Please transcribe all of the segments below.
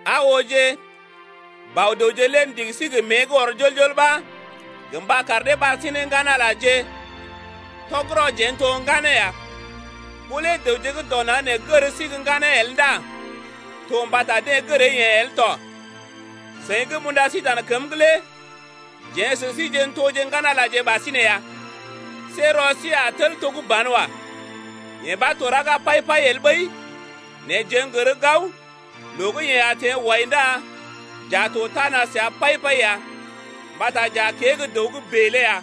Aa ooje, Bɔ-dəwje lé ndigi sí gə mée gə́ ɔr jol-jol ɓa gə mba kar dee ɓar sí ne ŋgan-Alaje. Tɔgərɔ jeḛ n’to gə́ ŋganeeje ya. Ɓó lé dəwje gə́ dɔ naŋg nee gər sí gə́ ŋganeeje el ndá to mbata deḛ gəree-yeḛ el tɔ. Seḭ gə́ m’unda sí dan kəm’g lé jeḛ sə síje n’toje ŋgan-Alaje ɓasinè ya. See rɔ sí a tel to gə́ banwa. Yee ɓa to raga pai-pai el ɓəi, nɛ jeḛ n’gər gao loo gə́ yeḛ a teḛ wai ndá j’a to tana səa pai-pai ya mbata j’a kée gə́ dəw gə́ bèe lé ya.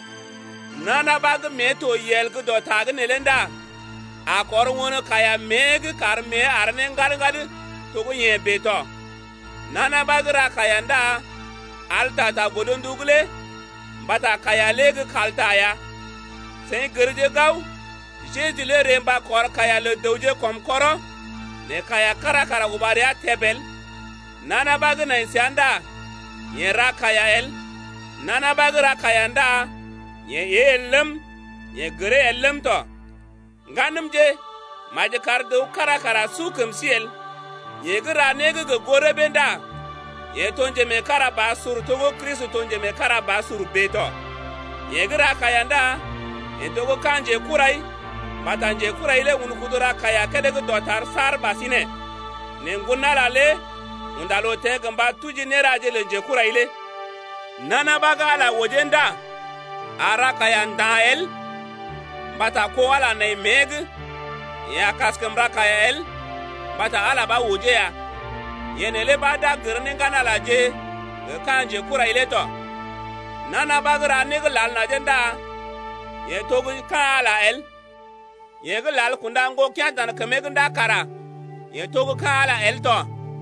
Nana ɓa gə́ mée to yel gə́ dɔ ta’g neelé ndá a kɔr won kaiya mée’g kar mée àr ne ŋgad-ŋgad to gə́ yeḛ bèe tɔ. Nana ɓa gə́ ra kaiya ndá al ta ta godndu’g lé, mbata kaiya lé gə́ kalta ya. Seḭ gərje gao, Jeju lé ree mba kɔr kaiya lə dəwje kɔm kɔrɔ nɛ kaiya kára kara uba rəa təb el. Nana ɓa gə́ nai səa ndá yeḛ ra kaiya el. Nana ɓa gə́ ra kaiya ndá yeḛ ée el ləm, yeḛ gəree el ləm tɔ. Ŋganəmje, maji kar dəw kára kara su kəm sí el. Yeḛ gə́ ra né gə́ gə goo rəbee ndá yeḛ to njemeekarabasur to gə́ Kristi to gə́ njemeekarabasur bèe tɔ. Yeḛ gə́ ra kaiya ndá yeḛ to gə́ ka̰ njekurai mbata njekurai lé un kudu ra kaiya kédé gə́ dɔtar saar ɓasinè. Nɛ Ŋgon-Ala lé unda loo teḛ gə mba tuji néraje lə njekurai lé. Nana ɓa gə́ Ala ojee ndá a ra kaiya nda̰ el mbata kó Ala nai mée’g, yeḛ a kaskəm ra kaiya el mbata Ala ɓa ojee ya. Yee neelé ɓa d’a gər ne ŋgan-Alaje gə ka̰ njekurai lé tɔ. Nana ɓa gə́ ra né gə́ lal najee ndá yeḛ to gə́ ka̰ Ala el, yeḛ gə́ lal kunda ŋgokea̰ dan kəmee’g ndá kara yeḛ to gə́ ka̰ Ala el tɔ.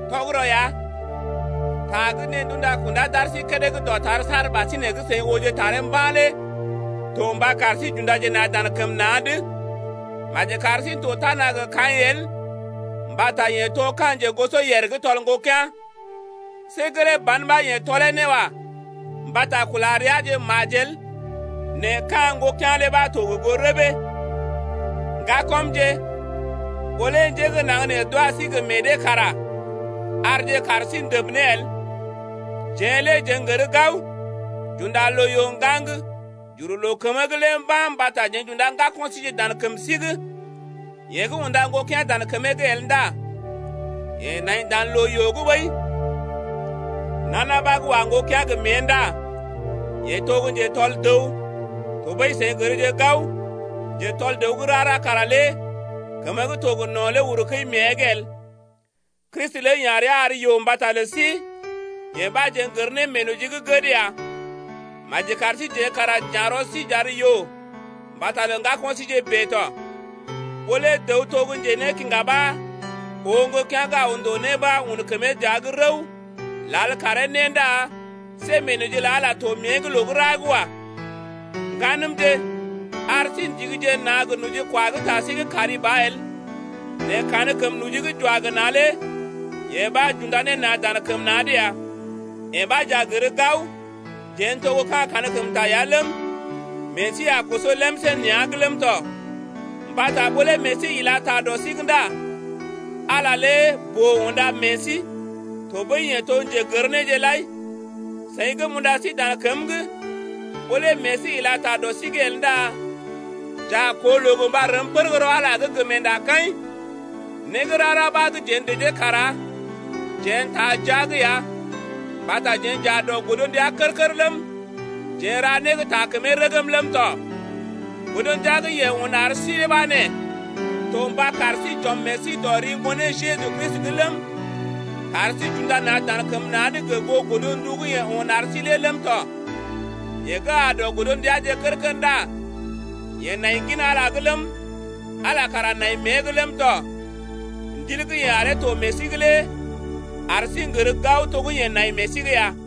Tɔgərɔ ya, ta gə́ deḛ d’unda kunda d’ar sí kédé gə́ dɔtar saar ɓasinè gə́ seḭ ooje taree mba̰ lé to mba kar sí j’undaje na̰ dan kəm na̰’d. Maji kar sí n’to tana gə Kaḭ el mbata yeḛ to ka̰ njegosoyèr gə́ tɔl ŋgokea̰. See gelee ban ɓa yeḛ tɔlee ne wa. Mbata kula reaje majel nɛ ka̰ ŋgokea̰ lé ɓa to gə goo rəbee. Ŋgakɔmje, ɓó lé njé gə́ naŋg nee d’wa sí gə meḛ dee kara arje kaar sí ndəb ne el. Jeḛ lé jeḛ n’gər gao, j’unda loo-yoo ŋgaŋ j’uru loo kəmə’g lé mba̰ mbata jeḛ j’unda ŋgako̰ síje dan kəm sí’g. Yeḛ gə́ unda ŋgokea̰ dan kəmee’g el ndá yeḛ nai dan loo-yoo’g ɓəi. Nana ɓa gə́ wa ŋgokea̰ gə mée ndá yeḛ to gə́ njetɔl dəw, tɔɓəi seḭ gərje gao, njetɔl dəw gə́ rara kara lé kəmə gə́ to gə no̰ lé uru kəi mée’g el. Kristi lé ya̰ rəa ar yoo mbata lə sí, yee ɓa jeḛ n’gər ne meenoji gə́ gəd ya, maji kar síjeḛ kara j’ya̰ rɔ sí j’ar yoo mbata lə ŋgako̰ síje bèe tɔ. Ɓó lé dəw to gə́ njenékiŋga ɓa oo ŋgokea̰ gə́ aw ndòo né ɓa un kəmee dəa’g rəw lal karee né ndá see meenoji lə Ala to mée’g loo gə́ ra’g wa. Ŋganəmje, ar sí ndigije na̰ gə nojikwa gə ta sí’g kari ba el nɛ kankəm noji gə́ j’wa gə na̰ lé yee ɓa j’unda ne na̰ dan kəm na̰’d ya. Yee ɓa j’a gər gao, jeḛ n’toje gə́ ka̰ kankəmta ya ləm, meḛ sí a koso lemsé nea̰’g ləm tɔ, mbata ɓó lé meḛ sí ila ta dɔ sí’g ndá Ala boo unda meḛ sí tɔɓəi yeḛ to gə́ njegər néje lai tɔ. Seḭ gə́ m’unda sí dan kəm’g, ɓó lé meḛ sí ila ta dɔ sí’g el ndá j’a koo loo gə mba rəm pər gə́ rɔ Ala’g lé gə meendakaḭ. Né gə́ rara ɓa gə́ jeḛ dəjee kara jeḛ n’taa jia’g ya mbata jeḛ j’aa dɔ godndia kər-kər ləm, jeḛ n’ra né gə́ taa kəmee rəgm ləm tɔ. Godndia gə́ yeḛ un ar sí ɓa nee: To mba kar sí j’ɔm meḛ sí dɔ ri Ŋgonee Jeju Kristi’g ləm, kar sí j’unda na̰ dan kəm na̰’d gə goo godndu gə́ yeḛ un ar sí lé ləm tɔ. Yeḛ gə́ aa dɔ godndiaje kər-kər ndá yeḛ naḭ gin Ala’g ləm, ala kara naḭ mée’g ləm tɔ. Ndil gə́ yeḛ aree to meḛ sí’g lé ar sí n’gər gao to gə́ yeḛ naḭ meḛ sí’g ya.